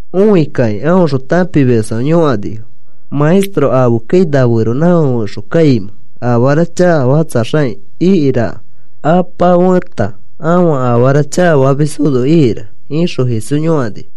Õikakĩ aõxõ tãpimisfãfe yõkanifo: “¿Maestro, afeskai na feronãfake fẽxo kãinimẽ? Afara chakafakatsaxakĩ ikaraka, apa feta ãfa afara chakafamisfono ikaraka,” ixõ Jesús yõkanifo.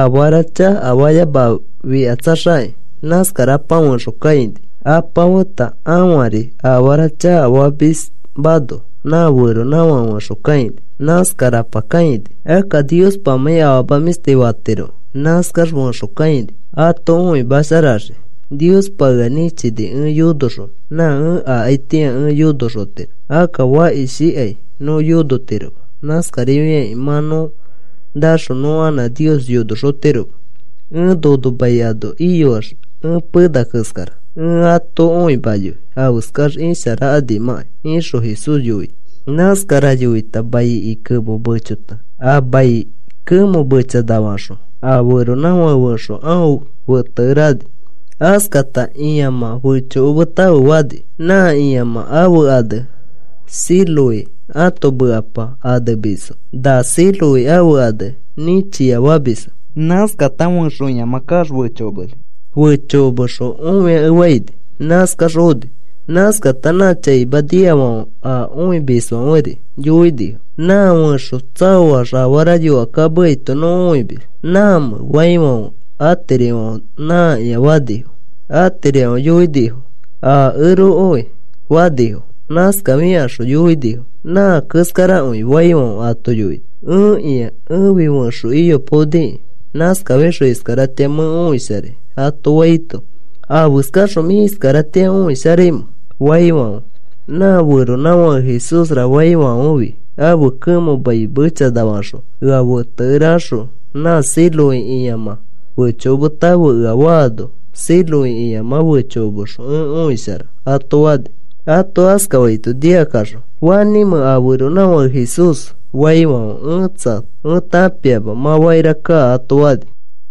“Afara chakafayamafikatsaxakĩ nãskarapa fẽxo kãini. Apa feta ãfari afara chakafamismano nã feronãfake fẽxo kãini. Nãskarapa kãini. Akka Niospamãi afama mĩshti fatirokẽ nãskax fẽxo kãini ato õimasharaxikĩ. Niospa ea nĩchini ẽ yonoxonõ. Nã ẽ akaitĩa ẽ yonoxotiro. Akka fakishikai nõ yonoxotiroma. Nãskarifiakĩ mã nõ naxõ nõ anã Nios yonoxotiroma. Ẽ nono mai ano iyoax ẽ pena keskara. Ẽ ato õimayoi afeskax isharakanimãkai,” ixõ Jesús yoini. Nãskara yoita maiki kemo mechota a mai kemõ mechanafaxõ a feronãfake fẽxo aõ fetekere ani. Askafata, “Ĩamã fechokometãfe,” fani. Nã ĩamã ãfe ane Siloé, ãto mekapa anemisfo na Siloé ãfe ane “Nĩchia” famisfo. Nãskata fẽxo ĩamã kaax fechokomeni. Fechokomexõ õiakefaini. Nãskax oni. Nãskata nã chaima nikafãfe a õimisfãferi yoinifo: “Nã fẽxo tsaoax afara yõkakameaito nõ õimis. ¿Nãmẽ?” faifãfe atirifãfe, “Nãkĩa,” fanifo. Atirifãfe yoinifo: “Akerokõi,” fanifo. Nãskafikaxõ yoinifo: “Nã keskarakõi,” faifãfe, ato yoini: “Ẽkĩa. Ẽfi fẽxo iyopaoniki. Nãskafixõ iskaratĩa mẽ õisharai,” ato faito, “¿Afeskaxõ mĩ iskaratĩa õisharaimẽ?” faifãfe, “Nã feronãfake ‘Jesúsra’ faifãfefi ãfe kemõ mai mechanafaxõ ea fetekere axõ: ‘Nã Siloé ĩamã fechokometãfe,’ ea faano, Siloé ĩamã fechokomexõ ẽ õishara,” ato fani. Ato askafaito nikakaxõ, “¿Fanĩmẽ a feronãfake Jesús?” faifãfe, “Ẽtsa ẽ tãpiama. Mã fakira kaa,” ato fani.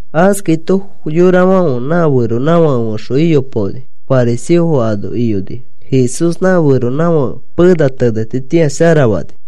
Askaito yorafãfe nã feronãfake fẽxo iyopaoni fariseofo ano iyonifo. Jesús nã feronãfake pena tenetitĩa sharafani.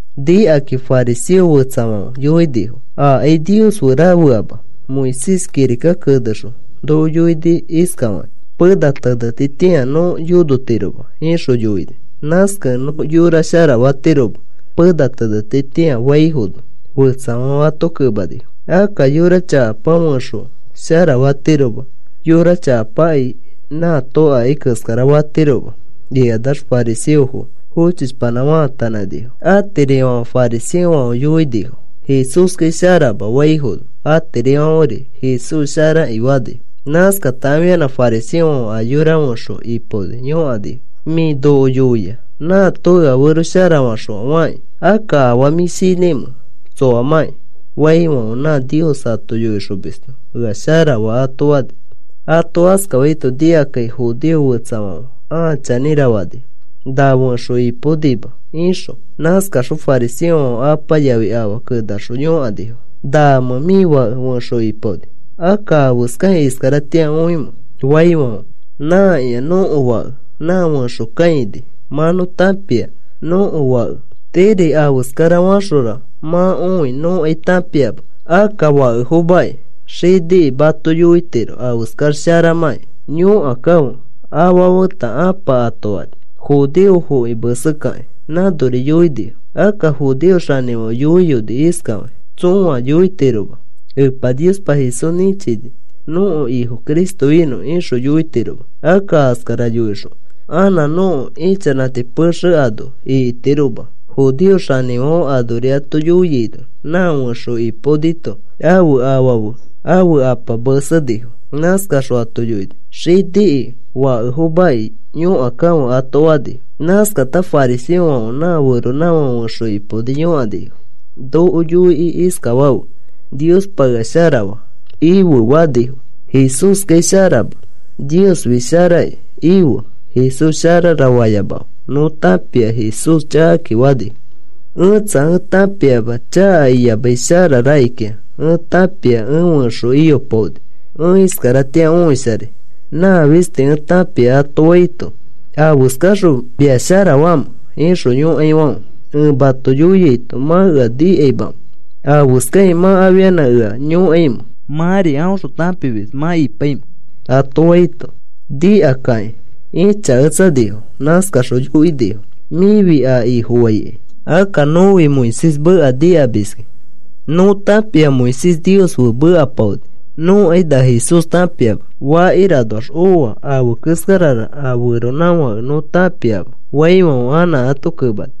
Nikakakĩ fariseo fetsafãfe yoinifo: “Akai Nios fe rafeama. Moisés kirika kenexõ noko yoini iskafakĩ: ‘Pena tenetitĩa nõ yonotiroma,’ ixõ yoini. Nãskakẽ nõ yora sharafatiroma pena tenetitĩa,” faifono, fetsafãfe ato kemanifo: “Akka yora chakapa fẽxo sharafatiroma. Yora chakapakai nãato akai keskara fatiroma,” ikanax fariseofo fochishpanã faatanãnifo. Atirifãfe fariseofãfe yoinifo: “Jesúskai sharama,” faifono, atirifãferi, “Jesús sharaki,” fanifo. Nãskata afianã fariseofãfe a yora fẽxo ipaoni yõkanifo: “Mĩ noko yoia, ‘Nãto ea fero sharafaxõa,’ fakĩ. ¿Akka afaa mĩ shinãimẽ tsoamãki?” faifãfe, “Nã Nios ato yoixomisto ea sharafaa,” ato fani. Ato askafaito nikakakĩ judeo fetsafãfe, “A chanĩra,” fanifo. “Na fẽxo ipaonima,” ixõ. Nãskaxõ fariseofãfe apa yafi afa kenaxõ yõkanifo. “¿Namẽ mĩ fake fẽxo ipaoni? Akka, ¿afeskakĩ iskaratĩa õimẽ?” faifãfe, “Nãkĩa nõko fake, nã fẽxo kãini. Mã nõ tãpia nõko fake. Tiiri afeskara axora mã õi nõkai tãpiama. Akka fakefomaki, xiniki mato yoitiroki afeskax sharamãki. Yõkakãfe,” afa feta ãpa ato fani. Judeofoki mesekakĩ nãnori yoinifo. Akka judeo xanĩfãfe yoiyoni iskafakĩ: “Tsõa yoitiroma: ‘Epa Niospa Jesús nĩchini nõko Ifo Cristo inõ,’ ixõ yoitiroma. Akka askara yoixõ anã nõko ichanãti pexe ano ikitiroma,” judeo xanĩfãfe anori ato yoiaino nã fẽxo ipaonito ãfe afa fe ãfe apa mesenifo. Nãskaxõ ato yoinifo: “Xiniki fakefomaki. Yõkakãfe,” ato fanifo. Nãskata fariseofãfe nã feronãfake fẽxo ipaoni yõkanifo: “Noko yoikĩ iskafafe: ‘Niospa ea sharafaa,’ ife,” fanifo. “Jesúskai sharama. ‘Niosfi sharaki,’ ife. ‘Jesús sharara,’ fayamafe. Nõ tãpia Jesús chakaki,” fanifo. “Ẽtsa. Ẽ tãpiama chaka iyamai shara rakikĩa. Ẽ tãpia ẽ fẽxo iyopaoni ẽ iskaratĩa õisharai. Nã fisti ẽ tãpia,” ato faito, “¿Afeskafaxõ mia sharafaamẽ?” ixõ yõkaifãfe, “Ẽ mato yoiaito, ¿mã ea nikamamẽ? ¿Afeskakĩ mã afianã ea yõkaimẽ? ¿Mãri aõxõ tãpimis mã ipaimẽ?” ato faito, nikakakĩ ĩchaketsanifo. Nãskaxõ yoinifo: “Mĩfi a Ifofaikai. Akka nõfi Moisés meka nikamiski. Nõ tãpia Moisés Nios fe mekapaoni. Nõkai na Jesús tãpiama. Fakira anoax oa afe keskarara a feronãfake nõ tãpiama,” faifãfe anã ato kemani: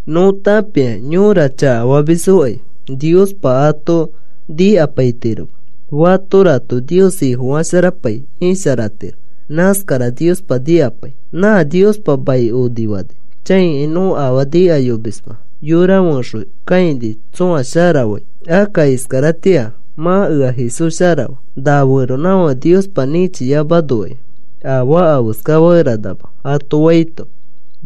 Nõ tãpia yõra chakafamisfokai Niospa ato nikapaitiroma. Fatorato Nios Ifofasharapai isharatiro. Nãskara Niospa nikapai. Nã Niospa mai onifani chãikai nõ afaa nikayomisma yora fẽxo kãini tsõa sharafai. Akka iskaratĩa mã ea Jesús sharafaa. Na feronãfake Niospa nĩchiyamanokai afaa afeskafakeranama,” ato faito,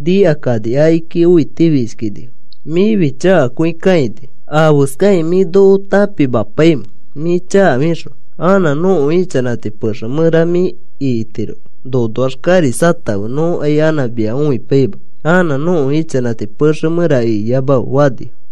nikakani akiki õitifishkinifo. “Mĩfi chakakõi kãini. ¿Afeskakĩ mĩ noko tãpimapaimẽ mĩ chakafixõ? Anã nõko ichanãti pexe mẽra mĩ ikitiroma. Nonoax kariskatãfe. Nõkai anã mia õipaima. Anã nõko ichanãti pexe mẽra ikiyamafe,” fanifo.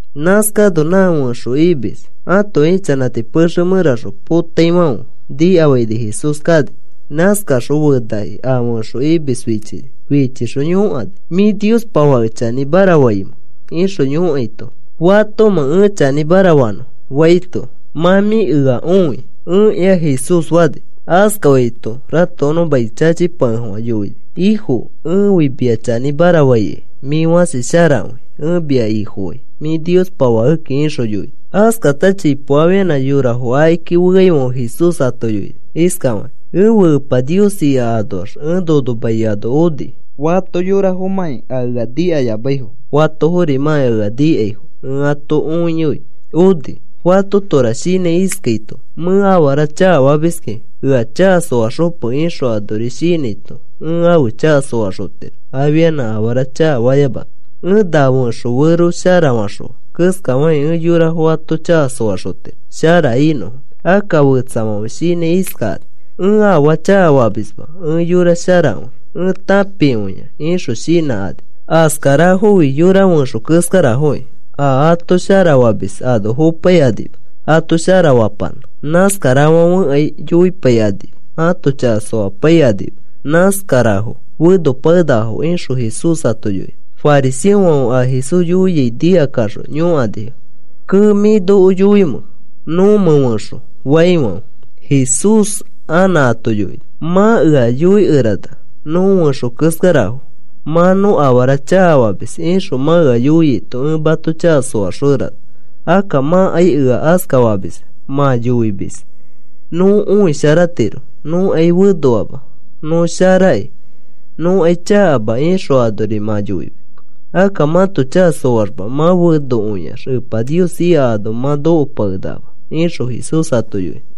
Nãskano nã fẽxo imis ãto ichanãti pexe mẽraxõ potaifãfe nikafaini Jesús kani. Nãskaxõ fenakĩ a fẽxo imis fichini. Fichixõ yõkani: “¿Mĩ Niospa Fake chanĩmara faimẽ?” ixõ yõkaito, “¿Fatomẽ ẽ chanĩmara fanõ?” faito, “Nã mĩ ea õi. Ẽkĩa,” Jesús fani. Askafaito ratokonõ mai chachipakefofã yoini: “Ifo, ẽfi mia chanĩmara faikai. Mĩ fãsi sharakõi. Ẽ mia Ifofai. Mĩ Niospa Fakeki,” ixõ yoini. Askata chipo afianã yorafo akiki feafãfe Jesús ato yoini iskafakĩ: “Ẽfe Epa Nios ika anoax ẽ nono mai ano oni. Fato yorafomãki a ea nikayamaifo, fatoforimãki a ea nikaifo ẽ ato õiyoi oni. Fatotora shinãi iskaito: ‘Mẽ afara chakafamiski. Ea chaka soaxope,’ ixõ anori shinãito ẽ ãfe chaka soaxotiro afianã afara chakafayamanõ. Ẽ na fẽxo fero sharafaxõa keskafakĩ ẽ yorafo ãto chaka soaxotiro shara inõfo. Akka fetsafãfe shinãi iskakani: ‘Ẽ afaa chakafamisma, ẽ yora sharakõi. Ẽ tãpikõia,’ ixõ shinãkani. Askarafofi yora fẽxo keskarafokĩ, a ato sharafamis ano fopaikanima ato sharafapanã. Nãskarafãfekai yoipaikanima ãto chaka soapaikanima. Nãskarafo fenopakenakafo,” ixõ Jesús ato yoini. Fariseofãfe a Jesús yoiai nikakaxõ yõkanifo: “Kee. ¿Mĩ noko yoimẽ nõmẽ fẽxo?” faifãfe Jesús anã ato yoini: “Mã ea yoikerana: ‘Nõ fẽxo keskarafo. Mã nõ afara chakafamis,’ ixõ mã ea yoiaito ẽ mato chaka soaxokerana. Akka mãkai ea askafamisma. Mã yoimis: ‘Nõ õisharatiro. Nõkai fenoama. Nõ sharakĩ. Nõkai chakama,’ ixõ anori mã yoimis. Akka mãto chaka soaxma, mã fenokõiax Epa Nios ika ano mã nokopakenakama,” ixõ Jesús ato yoini.